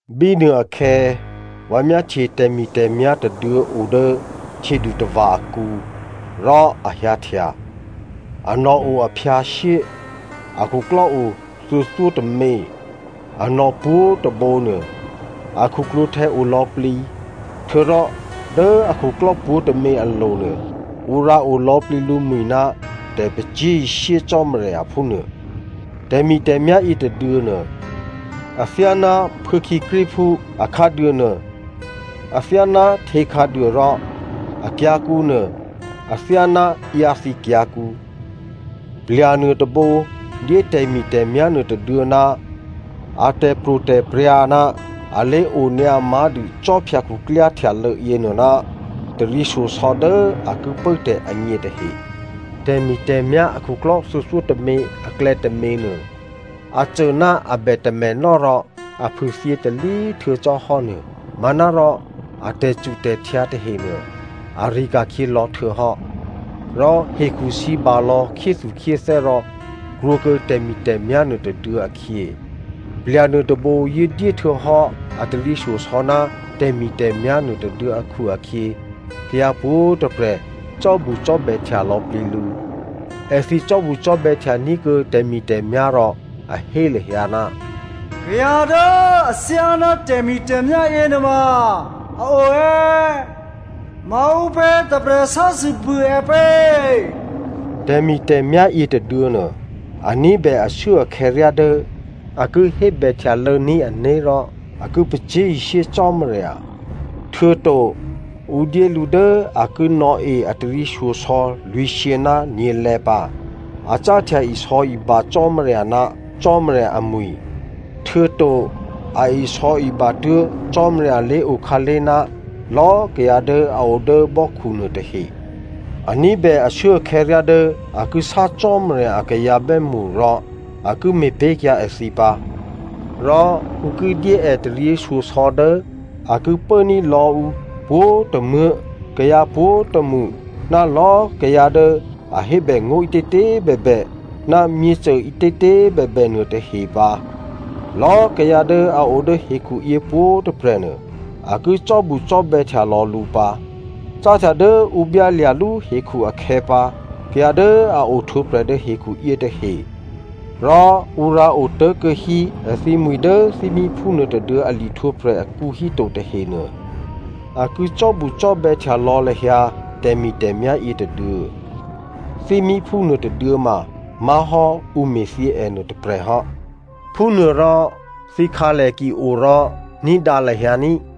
Bínuôakhè̌, vǎ myáhtye tè̤mi̤tè̤myá̤ tôduô̌ o dố htyědutava̤ akǔ rò a hyǎhtya. Anò̤ o aphyǎshyé, a khuklò́o thuô̌thyótômě, anò̤ pwǒ̤꤮ tôbǒ nuô, a khuklwǒ̤htè̌ olò̌plǐ, htuô̌rò dố akhuklò́ pwǒ̤tômě alo̤nuô ǔ rǎ olò̌plǐ lǔmwi̤ ná tè̤pacyé̤ishyé Cò́marya phúnuô. Tè̤mi̤tè̤myá̤ yětôduô̌ nuô, athyáná phuô̌khǐkríphú, akhǎduô nuô athyáná htě khǎduô rò akyǎ̤kǔ nuô athyáná ǎyǎthǐ kyǎ̤kǔ. Plya̤ nuôtôbǒ dyé tè̤mi̤tè̤myá̤ nuôtôduô̌ ná a tè̤pro̤tè̤prya̤ ná a lé̤onyǎ má̤dû khwí khuklyáhtè̌ htyalô̌ yěnuô ná taryěshyosò̌ dố a ki pốtè̤ agně tahe. Tè̤mi̤tè̤myá̤ akhuklò́ thuô̌thyótômě aklè̌ tôměnuô a cô ná a bè tamènò́ rò a phûthyě talí htuô̌ cò́hò́ nuô, manárò a tè̤cutè̤htyǎ tahenuô, ari̤ ka̤khyě lò̌ htuô̌hò́. Rò hekhusǐbalò̌ khyéthukhyéthè́ rò krwǒkuô̌ tè̤mi̤tè̤myá̤ nuôtôduô̌ akhyě. Plya̤ nuôtôbǒ yǒ dyé htuô̌hò́ a taryěshyosò̌ ná tè̤mi̤tè̤myá̤ nuôtôduô̌ akhu-akhyě, kayǎ pwǒ̤꤮ tôprè̤ cò́bucò́bè̌htya lò̌plǐ lǔ. Èthǐ cò́bucò́bè̌htya ní̤kuô̌ tè̤mi̤tè̤myá̤ rò a hé lahyǎ, “Kayǎ dố athyáná tè̤mi̤tè̤myá̤ yěnuôma a o è̌? Maǔpě tôprè̤ sásû bû è pě?” Tè̤mi̤tè̤myá̤ yětôduô̌ nuô, a ní̤bè ashuốakhè̌ ryá dố a ki hébè htyalô̌ní̤ ané̤ rò a ki pacyé̤ishyé Cò́marya, htuô̌to ǔ dyé lǔ dố a ki nò̌e a taryěshyosò̌ lwǐ̤shyě ná nyě̤lè̌ pǎ. A cáhtya isò̌iba Cò́marya ná Cò́marya amwi̤, htuô̌to a isò̌iba tuố̤ Cò́marya lé̤okhǎlé̤ ná lò̌꤮ kayǎ dố a o dố mò́khunuô tahe. A ní̤bè ashuốakhè̌ ryá dố a ki sá Cò́marya a kayǎ bè́mṳ rò a ki me̤pé̤kyǎ èthǐ pǎ, rò ǔ ki dyé è taryěshyosò̌ dố a ki pốní̤ lò̌ǔ pwǒ̤tômuố̤, kayǎ pwǒ̤tômṳ, ná lò̌꤮ kayǎ dố a hébè ngó̤ ǐtětě꤮ bèbè ná myěcô ǐtětě꤮ bèbè nuôtahe pǎ. Lò̌꤮ kayǎ dố a o dố hekhuyě pwǒ̤꤮ tôprè̤ nuô, a ki cò́bucò́bè̌htya lò̌ lǔ pǎ. Cáhtya dố ǔ byálya̤lú hekhu akhè̌pǎ, kayǎ dố a ohtwǒprè̤ dố hekhu yětahe rò ǔ rǎotố̤kuô̌ hí èthǐmwi̤ dố thímíphú nuôtôduô̌ a lihtwǒprè̤ akǔ híto tahenuô, a ki cò́bucò́bè̌htya lò̌ lahyǎ tè̤mi̤tè̤myá̤ yětôduô̌. Thímíphú nuôtôduô̌ ma má̤hò́ ǔ me̤thyě ènuô tôprè̤ hò́. Phúnuôrò thǐkhǎlè ki o rò ní̤dǎ lahyǎ ní꤮.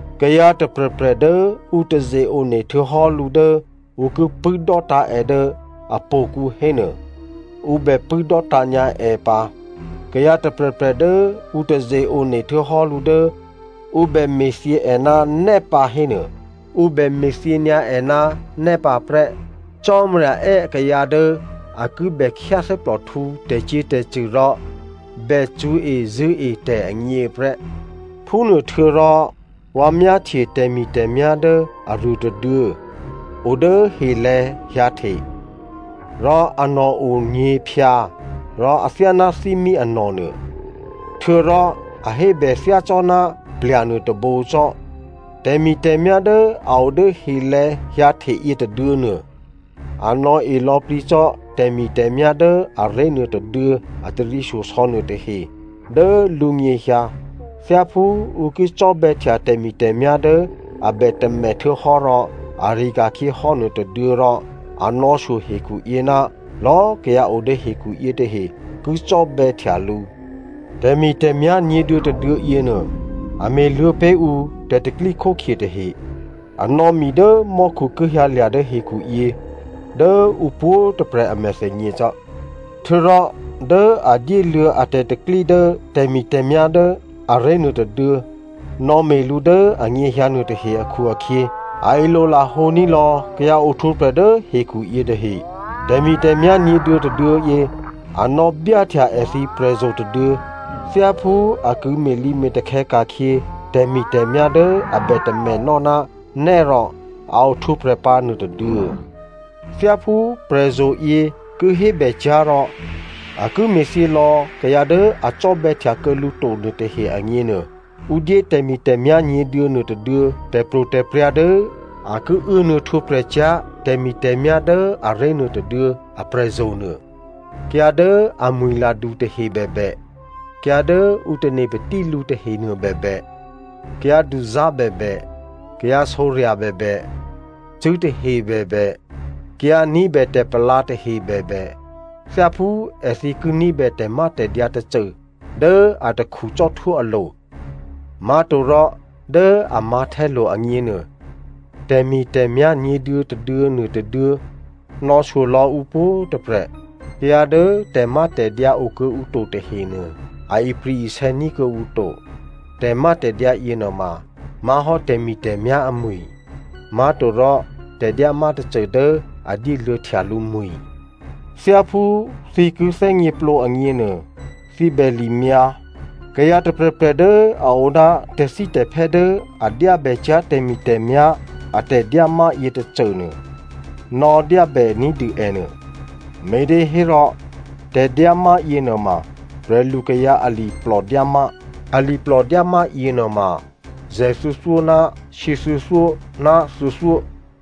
Kayǎ tôprè̤prè̤ dố ǔ taze-one htuô̌hò́ lǔ dố ǔ ki pṳ̂́ dò́tǎ̤ è dố htò̌kǔ hénuô, ǔ bè pṳ̂́ dò́tǎ̤ nyǎ è pǎ. Kayǎ tôprè̤prè̤ dố ǔ taze-one htuô̌hò́ lǔ dố ǔ bème̤thyě è ná nè́ pǎ hò́nuô, ǔ bè me̤thyě nyǎ è ná nè́ pǎ prè́. Cò́marya è́ akayǎ dố a ki bèkhyáthè́plòhtǔ tè̤cyě̤tè̤cṳ̂ rò bè cṳ̌ezṳ̂́e tè̤ agněprè́. Phúnuôhtuô̌rò vǎ myáhtye tè̤mi̤tè̤myá̤ dố aruô tôduô̌ o dố helè̤̌ hyǎhte. Rò anò̤ o nyě̤phyǎ rò athyáná thímí anò̤ nuô, htuô̌rò a hébè thyácò́ná plya̤ nuôtôbǒ cò́. Tè̤mi̤tè̤myá̤ dố a o dố helè̤̌ hyǎhte yětôduô̌nuô, a nò̌e lò̌plǐ cò́ tè̤mi̤tè̤myá̤ dố aré̤ nuôtôduô̌ a taryěshyosò̌ nuôtahe dố lǔnyěhyǎ thyáphú ǔ ki cò́bè̌htya tè̤mi̤tè̤myá̤ dố a bè tamè htuô̌hò́ rò ari̤ ka̤khyěhò́ nuô tôduô̌, rò a nò̌shyo hekhuyě ná lò̌ kayǎ o dố hekhu yětahe ki cò́bè̌htya lǔ. Tè̤mi̤tè̤myá̤ nyě̤duô̌ tôduô̌ yěnuô, a me̤luô̌ pé̤ ǔ tè̤ tè̤pro̤tè̤prya̤ tahe. A nò̌ mi dố mò́khu ki hyǎlya̤ dố hekhuyě dố ǔ pwǒ̤꤮ tôprè̤ a mèthènyě cò́. Htuô̌rò dố a dyéluô̌ a tè̤pro̤tè̤prya̤ dố tè̤mi̤tè̤myá̤ dố aré̤nuô tôduô̌ nò̌me̤ lǔ dố anyěhyǎ nuôtahe akhu-akhyě, a ilolahǒ ní̤lò̌ kayǎ ohtwǒprè̤ dố hekhu yě tahe. Tè̤mi̤tè̤myá̤ nyě̤duô̌ tôduô̌yě, a nò̌byáhtya èthǐ prè̤zo̤ tôduô̌ thyáphú a ki me̤lǐme̤takhè̌ ka̤khyě tè̤mi̤tè̤myá̤ dố a bè tamènò́ ná nè́ rò a ohtwǒprè̤ pǎ nuôtôduô̌. Thyáphú prè̤zo̤yě ki hébècyá̤ rò a ki me̤thyělò̌ kayǎ dố a cò́bè̌htya kuô̌ lǔ to nuôtahe agněnuô, ǔ dyé tè̤mi̤tè̤myá̤ nyě̤duô̌ nuôtôduô̌ tè̤pro̤tè̤prya̤ dố a ki uốnuô̌ htwǒprè̤cyá̤ tè̤mi̤tè̤myá̤ dố aré̤ nuô tôduô̌ aprè̤zo̤ nuô. Kayǎ dố amwi̤ladu tahe bèbè, kayǎ dố ǔ tane̤ patí lǔ tahenuô bèbè, kayǎ duzá̤ bèbè, kayǎ sǒrya̤ bèbè, cṳ̂́ tahe bèbè, kayǎ ní̤bè tè̤palǎ tahe bèbè, thyáphú èthǐ ki ní̤bè tè̤mátè̤dyǎ tôcô dố atakhu cò́htwó alo̤, má̤torò dố a mǎ̤htè́lo̤ agněnuô tè̤mi̤tè̤myá̤ nyě̤duô̌tôduô̌ nuôtôduô̌ nò̌shyo lò̌ ǔ pwǒ̤꤮ tôprè̤. Kayǎ dố tè̤mátè̤dyǎ okuô̌ǔ to tahenuô, a ipri̤-isè̌ ní̤ kuô̌ǔ to. Tè̤mátè̤dyǎ yěnuôma má̤hò́ tè̤mi̤tè̤myá̤ amwi̤, má̤torò tè̤dyámá tôcô dố a dyé luô̌htya lǔmwi̤. Thyáphú thǐ ki thè́gněplǒ agněnuô, thǐ bè limyǎ. Kayǎ tôprè̤prè̤ dố a o ná tè̤thítè̤phè́ dố a dyábècyá̤ tè̤mi̤tè̤myá̤ a tè̤dyámá yětôcô nuô, nò̌dyábè ní̤dû ènuô, me̤těhérò tè̤dyámá yěnuôma prè̤lukayǎ aliplò dyámá. Aliplò dyámá yěnuôma zè̤thuô̌thyó ná shyěthuô̌thyó ná thuô̌thyó.